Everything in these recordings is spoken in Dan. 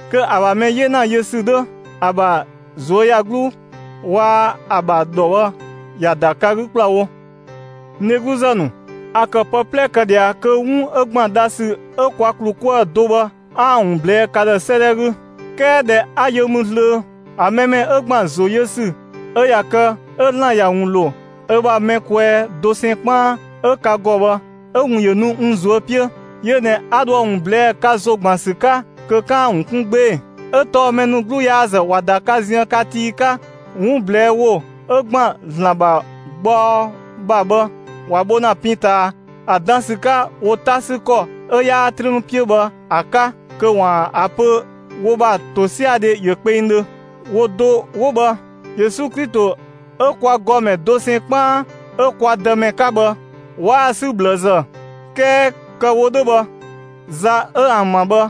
Kö ‑a ‑bha mɛ 'yena yö ‑sü 'dhö, ‑a ‑bha ꞊zuöyagluu, waa‑ ‑a ‑bha ‑dhɔ bhë, ‑ya ‑da ka 'gü ‑kplawo. N dhegluzë ‑nu, a ‑kë pë 'plɛ kë ꞊dhia kö 'wun 'ö ‑gban dhasü 'ö kwa ‑klu 'kuë‑ do bhë 'aan‑ ‑wun ꞊blɛɛ'‑ ka ‑dhë 'sëëdhɛ 'gü; 'kɛɛ ꞊dhɛ 'a yö mü zlöö, ‑a mɛ mɛ 'ö ‑gban ‑zo yö ‑sü 'ö ꞊ya kë 'ö ‑Zlan ‑ya ‑wun ‑lo ö ‑bha mɛ kwɛɛ dosɛn 'kpaan 'ö ka ‑gɔ bhë, 'ö‑ ‑wun ‑yö nu n ꞊zuö' 'piö. Yö ꞊nɛ 'a dho ‑a ‑wun ꞊blɛɛ'‑ ka ‑zo ‑gban ‑sü 'ka kö 'kaan‑ ‑a ‑wun 'kun 'gbee‑. 'Ö tɔɔ mɛ ‑nu 'gluyaazë ꞊wa ‑da ka ziën ka tii 'ka; 'wun ꞊blɛɛ'‑ ‑wo 'ö ‑gban ‑Zlan ‑bha gbaɔ ‑bha bhë, ‑wa bho ‑na pin ꞊taa ‑a dan ‑sü 'ka wo 'ta sü ‑kɔ 'ö 'yaa 'trüün 'piö bhë ‑a 'ka kö ‑waan ‑a pö wo ‑bha ‑tosiadhe ‑yö kpengdhö. Wo do 'wo bhë, Yesu Klito 'ö kwa ‑gɔmɛ dosɛn 'kpaan 'ö kwa Dëmɛ 'ka bhë, 'waa‑ 'sü ꞊bhlëzë. 'Kɛɛ kë‑ wo 'dhö bhë, za 'ö ‑an ‑bha bhë,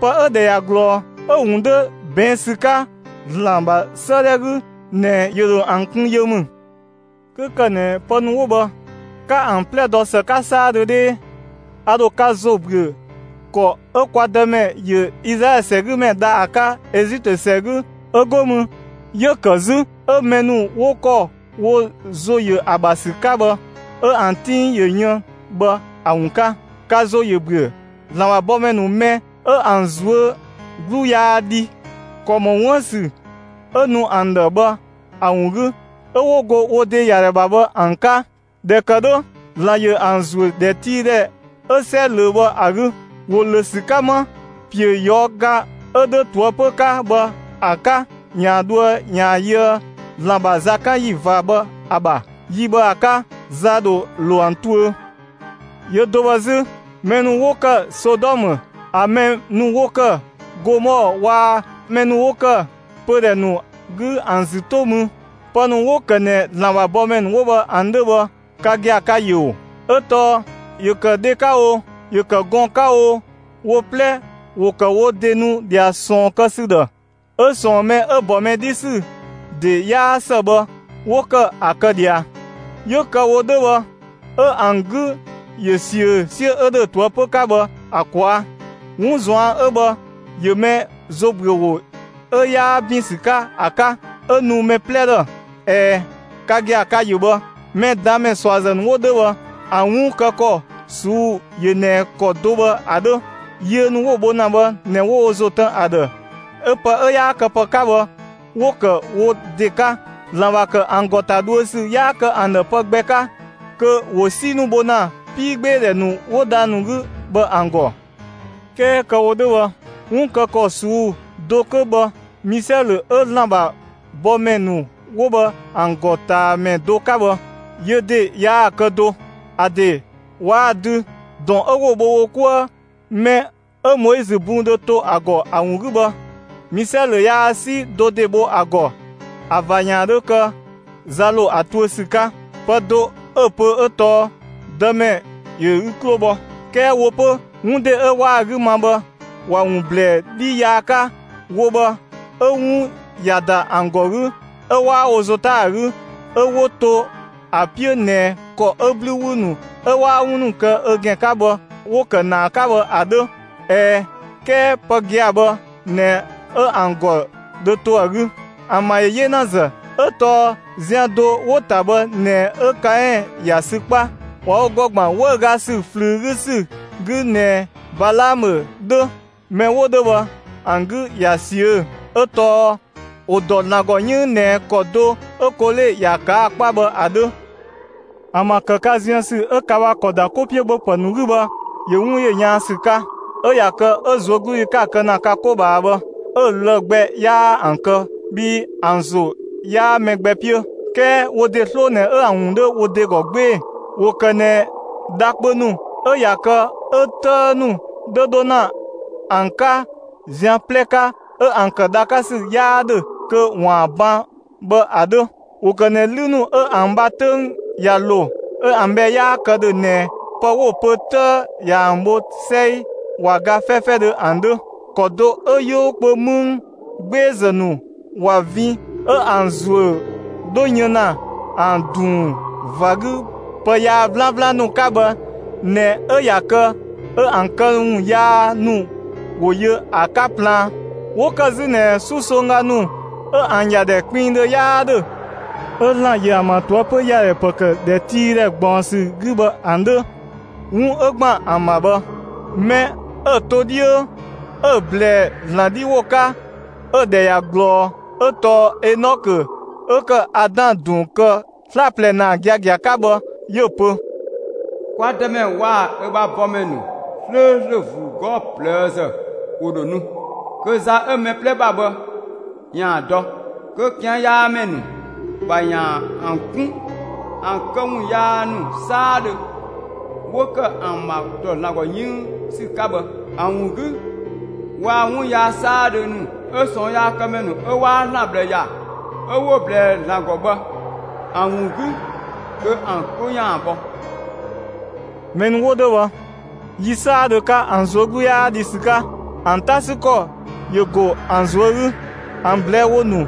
pë 'ö‑ ‑dhɛ ꞊ya ꞊glɔɔ, 'ö‑ ‑wun 'dhö ꞊bɛɛn' ‑sü 'ka ‑Zlan ‑bha 'sëëdhɛ 'gü ꞊nɛ ‑yö ‑dho ‑an kun yö ‑mü. 'Kö ‑kë ꞊nɛ pë ‑nu 'wo bhë, 'ka ‑an 'plɛ dɔ ‑së 'ka 'saadhö 'dhee, a ‑dho ka ‑zo ‑büö ‑kɔ 'ö kwa Dëmɛ ‑yö Izlaɛlö ‑sɛgümɛ dha ‑a 'ka Ezitö ‑sɛ 'gü 'ö 'go mü, 'yö‑ ‑kë 'zü 'ö mɛ ‑nu 'wo ‑kɔ wo ‑zo ‑yö ‑a ‑bha ‑sü 'ka bhë 'ö ‑an 'tiin ‑yö yën bhë ‑a ‑wun 'ka. Ka ‑zo ‑yö ‑büö ‑Zlan ‑bha bɔmɛ ‑nu mɛ 'ö ‑an ꞊zuö' 'glu yaa dhi ‑kɔ ‑mɔ 'wuën‑ ‑sü 'ö nu ‑an ‑dhë bhë ‑a ‑wun 'gü 'ö 'wo go wo ‑de ‑ya ‑dhɛ ‑bha bhë ‑an 'ka. ꞊Dhɛ ‑kë 'dhö, ‑Zlan ‑yö ‑an ‑zuö ‑dhɛtiidhɛ 'ö 'sɛ ꞊löö bhë ‑a 'gü. ‑Wo ‑lö ‑sü 'ka 'ma ‑piö ꞊yɔɔga 'ö 'dhö ꞊toëpö 'ka bhë ‑a 'ka ‑yaan dhoë ‑yaan yöë ‑Zlan ‑bha zakanyi ꞊va bhë ‑a ‑bha. Yi bhë ‑a 'ka, za ‑dho ‑lo ‑an tuö. Yö do bhë 'zü, mɛ ‑nu 'wo ‑kë Sodɔmë, ‑an mɛ ‑nu 'wo ‑kë Gomɔɔ waa‑ mɛ ‑nu 'wo ‑kë pödhɛ ‑nu 'gü ‑an ‑zü 'to mü, (pë ‑nu 'wo‑ ‑kë ꞊nɛ ‑Zlan ‑bha bɔmɛ ‑nu 'wo bhë ‑an 'dhö bhë ka gia‑, ka‑ ‑yö ‑oo!) 'ö tɔɔ ‑yö ‑kë dhe 'ka oo, ‑yö ‑kë gɔɔn‑ 'ka oo, wo 'plɛ, ‑wo ‑kë wo ‑de nu ꞊dhia ꞊sɔɔn kë ‑sü ‑dhë 'ö ꞊sɔɔn mɛ 'ö‑ ‑bɔ mɛ 'dhi ‑sü ‑de 'yaa ‑së bhë, 'wo ‑kë ‑a kë ꞊dhia. 'Yö kë‑ wo 'dhö bhë 'ö ‑an 'gü ‑yö ꞊siö 'siö 'ö ‑dhö ꞊toëpö 'ka bhë ‑a ꞊kwaa'. 'Wun ꞊zuan' 'ö bhë ‑yö mɛ ‑zobüöwo 'ö 'yaa ‑bin ‑sü 'ka ‑a 'ka, 'ö nu mɛ 'plɛ ‑dhë. ꞊Ɛɛ, ka gia‑, ka‑ ‑yö bhë! Mɛ ꞊daan' ‑mɛ ꞊suazë ‑nu 'wo 'dhö bhë ‑an 'wun kë ‑kɔ ꞊suu'‑ ‑yö ꞊nɛ ‑kɔ do bhë ‑a 'dhö: Yiö ‑nu 'wo‑ bho ‑na bhë ꞊nɛ 'wo wo ‑zo tën ‑a ‑dhë 'ö pë 'ö 'yaa kë pë 'ka bhë 'wo‑ ‑kë wo ‑de 'ka; ‑Zlan ‑bha ‑kë ‑an ‑gɔ ‑ta dhuö ‑sü 'yaa kë ‑an ‑dhë pë gbɛ 'ka; kö ‑wo 'si ‑nu bho ‑na 'piigbeedhɛ ‑nu 'wo dhang‑ 'gü bhë ‑an ‑gɔ. 'Kɛɛ kë‑ wo 'dhö bhë 'wun kë ‑kɔ ꞊suu'‑ do 'kö bhë Misɛlö 'ö ‑Zlan ‑bha bɔmɛ ‑nu 'wo bhë ‑an ‑gɔtaamɛ do 'ka bhë, yö ‑de yaa‑ kë do. ‑A ‑de waa‑ dü, ‑dɔn 'ö 'wo‑ bho wo 'kuë mɛ 'ö Moizö bun dho to ‑a ‑gɔ ‑a ‑wun 'gü bhë, Misɛlö yaa 'si do ‑de bho ‑a ‑gɔ ‑a ꞊va ‑yaan 'dhö kë za ‑lo ‑a tuö ‑sü 'ka. Pë do 'ö‑ pö 'ö tɔɔ: «Dëmɛ ‑yö ü 'klo bhɔ»! 'Kɛɛ wo 'pö, 'wun ‑de 'ö 'waa‑ 'gü ma bhë, ‑wa ‑wun ‑blɛɛ 'dhi yaa 'ka; wo bhë 'ö 'wun ‑ya ‑da ‑an ‑gɔ 'gü 'ö 'waa wo ‑zo 'ta ‑a 'gü 'ö 'wo to ‑a 'piö ꞊nɛ ‑kɔ 'ö 'blü ‑wü ‑nu 'ö 'waa 'wun ‑nu kë ö ‑gɛn 'ka bhë, 'wo kë ‑naa 'ka bhë ‑a 'dhö. ꞊Ɛɛ, 'kɛɛ pë gia‑ bhë ꞊nɛ 'ö ‑an ‑gɔ dho to ‑a 'gü. ‑An ‑bha ‑yö 'yenazë, 'ö tɔɔ zian do 'wo‑ ‑ta bhë ꞊nɛ 'ö Kaɛn ‑ya sü 'kpa. ꞊Wa wo ‑gɔ ‑gban 'wëüga ‑sü ꞊flüü 'gü ‑sü 'gü ꞊nɛ Balaamö 'dhö. Mɛ 'wo 'dhö bhë ‑an 'gü ꞊ya ꞊siö'‑; 'ö tɔɔ ‑wo ‑dɔ ‑Zlan ‑gɔ 'yënng ꞊nɛ ‑kɔ do 'ö Kole ‑ya ꞊kaa' 'kpa bhë ‑a 'dhö. ‑An ‑bha ‑kë ka ziën ‑sü 'ö ka ‑bha ‑kɔ ‑da 'ko 'piö ‑bhöpë ‑nu 'gü bhë, ‑yö 'wun ‑yö yaan ‑sü 'ka; 'ö ꞊ya kë 'ö ꞊zuögludhi 'ka‑ kë ‑na ka 'ko ꞊bhaa bhë, 'ö‑ lë‑ gbɛ 'yaa ‑an ‑kë bhii ‑an ‑zo 'yaa mɛ gbɛ 'piö, 'kɛɛ wo ‑de 'sloo ꞊nɛ 'ö ‑an ‑wun 'dhö wo ‑de ‑gɔ 'gbee‑. ‑Wo ‑kë ꞊nɛ dha kpö ‑nu 'ö ꞊ya kë 'ö 'tëë ‑nu 'dhö 'dho ‑na ‑an 'ka zian 'plɛ 'ka 'ö ‑an ‑kë dha 'ka ‑sü 'yaa ‑dhö kö ‑waan ban bhë ‑a 'dhö. ‑Wo ‑kë ꞊nɛ 'lü ‑nu 'ö ‑an ‑bha 'töng ꞊ya ‑lo, 'ö ‑an bhɛ 'yaa kë ‑dhö ꞊nɛ pë 'wo‑ pö 'tëë ꞊yaa‑ ‑an bho 'sɛi, ꞊wa ga 'fɛfɛdhö ‑an 'dhö. ‑Kɔ do 'ö 'yoo kpö 'mëng 'gbeezë ‑nu ꞊wa vin 'ö ‑an ‑zuö 'dhö yën ‑na ‑an ‑dunng ꞊va 'gü pë yaa 'vlanvlan ‑nu 'ka bhë ꞊nɛ 'ö ꞊ya kë 'ö ‑an këwun yaa ‑nu ‑wo yö ‑a 'ka plaan. 'Wo ‑kë 'zü ꞊nɛ 'susongga ‑nu 'ö ‑an ‑yadhɛ kpinngdhö 'yaa 'dhö 'ö ‑Zlan ‑yö ‑an ‑bha ꞊toëpö ‑yadhɛ ‑pë ‑kë ‑dhɛtiidhɛ ꞊gbaɔnsü 'gü bhë ‑an 'dhö. 'Wun 'ö ‑gban ‑an ‑bha bhë, mɛ 'ö‑ to 'dhiö 'ö‑ ꞊blɛɛ ‑Zlan 'dhi ‑wo 'ka ö‑ ‑dhɛ ꞊ya ꞊glɔɔ 'ö tɔɔ Enɔkö 'ö ‑kë Adan ‑dun kë 'slaplɛ ‑naa giagia 'ka bhë. 'Yö‑ pö: «Kwa Dëmɛ waa‑ ö ‑bha bɔmɛ ‑nu 'slööslö ‑vuu 'gɔɔ‑ ꞊plëëzë ‑wo ‑dho nu, kö za 'ö mɛ 'plɛ ‑bha bhë ‑yaan dɔ; kö ꞊kian' yaa ‑mɛ ‑nu ‑bha ‑yaan ‑an 'kun ‑an këwun yaa ‑nu 'saadhö 'wo‑ ‑kë ‑an ‑bha ‑dɔ ‑Zlan ‑gɔ 'yënng ‑sü 'ka bhë ‑a ‑wun 'gü, waa‑ 'wun yaa 'saadhö ‑nu 'ö ꞊sɔɔnyaakëmɛ ‑nu 'ö 'waa ‑Zlan ꞊bhlë ‑ya 'ö 'wo‑ ꞊blɛɛ ‑Zlan ‑gɔ bhë ‑an ‑wun 'gü (kö ‑an 'klo ‑yaan bhɔ).» Mɛ ‑nu 'wo 'dhö bhë, yi 'saadhö 'ka, ‑an ꞊zuö' 'glu 'yaa dhi ‑sü 'ka; ‑an 'ta ‑sü ‑kɔ ‑yö ‑go ‑an ꞊zuö' 'gü. ‑An ꞊blɛɛ'‑ ‑wo ‑nu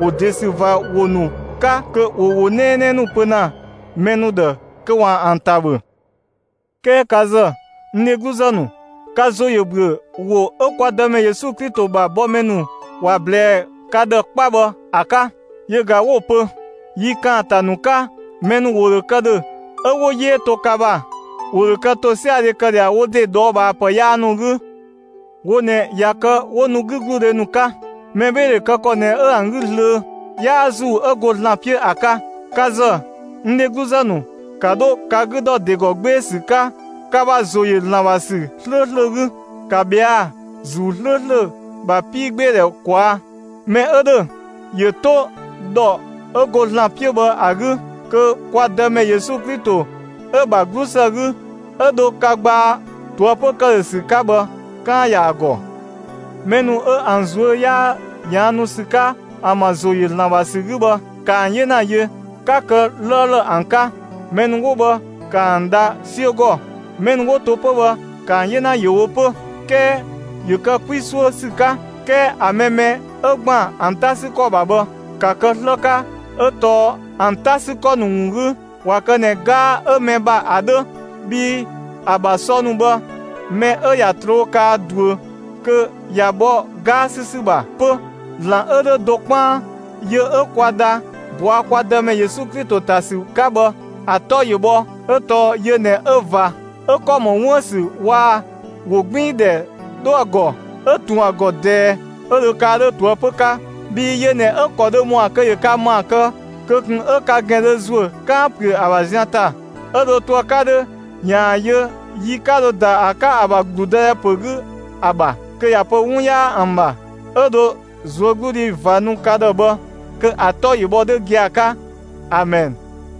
‑wo ‑de ‑sü ꞊va ‑wo ‑nu 'ka kö ‑wo ‑wo 'nɛɛnɛɛ ‑nu pö ‑na mɛ ‑nu ‑dhë kö ‑waan ‑an ‑ta ‑bhö. 'Kɛɛ ka ‑zë, n dhegluzë ‑nu, ka ‑zo ‑yö ‑büö ‑wo 'ö kwa Dëmɛ Yesu Klito ‑bha bɔmɛ ‑nu ‑wa ꞊blɛɛ ka ‑dhë 'kpa bhë ‑a 'ka; yö ꞊ga 'wo‑ pö: «Yi ‑kaanta ‑nu 'ka, mɛ ‑nu ‑wo ‑dho kë ‑dhö 'ö 'wo 'yee to ka ‑bha; ‑wo ‑dho kë ‑tosiadhe kë ꞊dhia wo ‑de ꞊dhɔɔbhaapë yaa ‑nu 'gü.» Wo ꞊nɛ ꞊ya kë 'wo nu 'gügludhe ‑nu 'ka; mɛbheedhe kë ‑kɔ ꞊nɛ 'ö ‑an 'gü zlöö; 'yaa ‑Zuu 'ö go ‑Zlan 'piö ‑a 'ka. Ka ‑zë, n dhegluzë ‑nu, ‑ka 'dho ka 'gü ‑dɔ ‑de ‑gɔ 'gbee‑ ‑sü 'ka ka ‑bha ‑zo ‑yö ‑Zlan ‑bha ‑sü 'slööslö 'gü. ‑Ka ꞊bhɛa' ‑Zuu 'slööslö ‑bha 'piigbeedhɛ ꞊kwaa'. Mɛ 'ö ‑dhö, ‑yö 'to ‑dhɔ 'ö go ‑Zlan 'piö bhë ‑a 'gü, kö kwa Dëmɛ Yesu Klito 'ö‑ ‑bha 'glusë 'gü 'ö dho ka gbaa ꞊toëpö ‑këdhösü 'ka bhë, 'kaan‑ ‑ya ‑a ‑gɔ. Mɛ ‑nu 'ö ‑an ꞊zuö' 'yaa ꞊yaannu ‑sü 'ka ‑an ‑bha ‑zo ‑yö ‑Zlan ‑bha ‑sü 'gü bhë, ‑ka ‑an 'yena yö, ('ka kë 'lëëlë ‑an 'ka)! Mɛ ‑nu 'wo bhë ‑ka ‑an dha 'siö ‑gɔ; mɛ ‑nu 'wo to 'pö bhë, ‑ka ‑an 'yena ‑yö wo 'pö, 'kɛɛ ‑yö kë 'kwi 'suö ‑sü 'ka. 'Kɛɛ ‑a mɛ mɛ 'ö ‑gban ‑an 'ta ‑sü ‑kɔ ‑bha bhë, ‑ka kë 'slë 'ka 'ö tɔɔ ‑an 'ta 'sü ‑kɔ ‑nu ‑wun 'gü, ꞊wa kë ꞊nɛ 'gaa 'ö mɛ ‑bha ‑a 'dhö (bhii ‑a ‑bha sɔ ‑nu bhë, mɛ 'ö ꞊ya ꞊troo' kaa ꞊duö kö ꞊ya bhɔ 'gaa 'sü ‑sü ‑bha 'pö). ‑Zlan 'ö 'dhö do 'kpaan, yö 'ö kwa dha ꞊bɔa' kwa Dëmɛ Yesu Klito ‑ta ‑sü 'ka bhë, ‑a 'tɔ ‑yö bhɔ 'ö tɔɔ yö ꞊nɛ 'ö ꞊va, 'ö ‑kɔ ‑mɔ 'wuën‑ ‑sü waa‑ ‑wogbiindhɛ 'dhö ‑a ‑gɔ, 'ö ꞊tun ‑a ‑gɔ ꞊dɛɛ; 'ö dho kaa 'dhö ꞊toëpö 'ka. Bhii yö ꞊nɛ 'ö‑ ‑kɔ dhö ‑mɔa kö ‑yö ka ‑maa kë kö ꞊kun 'ö ka ‑gɛn dho ‑zuö 'kaan‑ ‑püö ‑a ‑bha zian ‑ta, 'ö dho to ‑a 'ka 'dhö ‑yaan yö yi 'ka dho ‑da ‑a 'ka ‑a ‑bha ‑gludëdhɛ ‑pö 'gü ‑a ‑bha, kö ‑ya pö 'wun 'yaa ‑an ‑bha, 'ö dho ꞊zuögludhi ꞊va nu ka ‑dhë bhë; kö ‑a 'tɔ ‑yö bhɔ 'dhö gia‑ 'ka. Amɛn.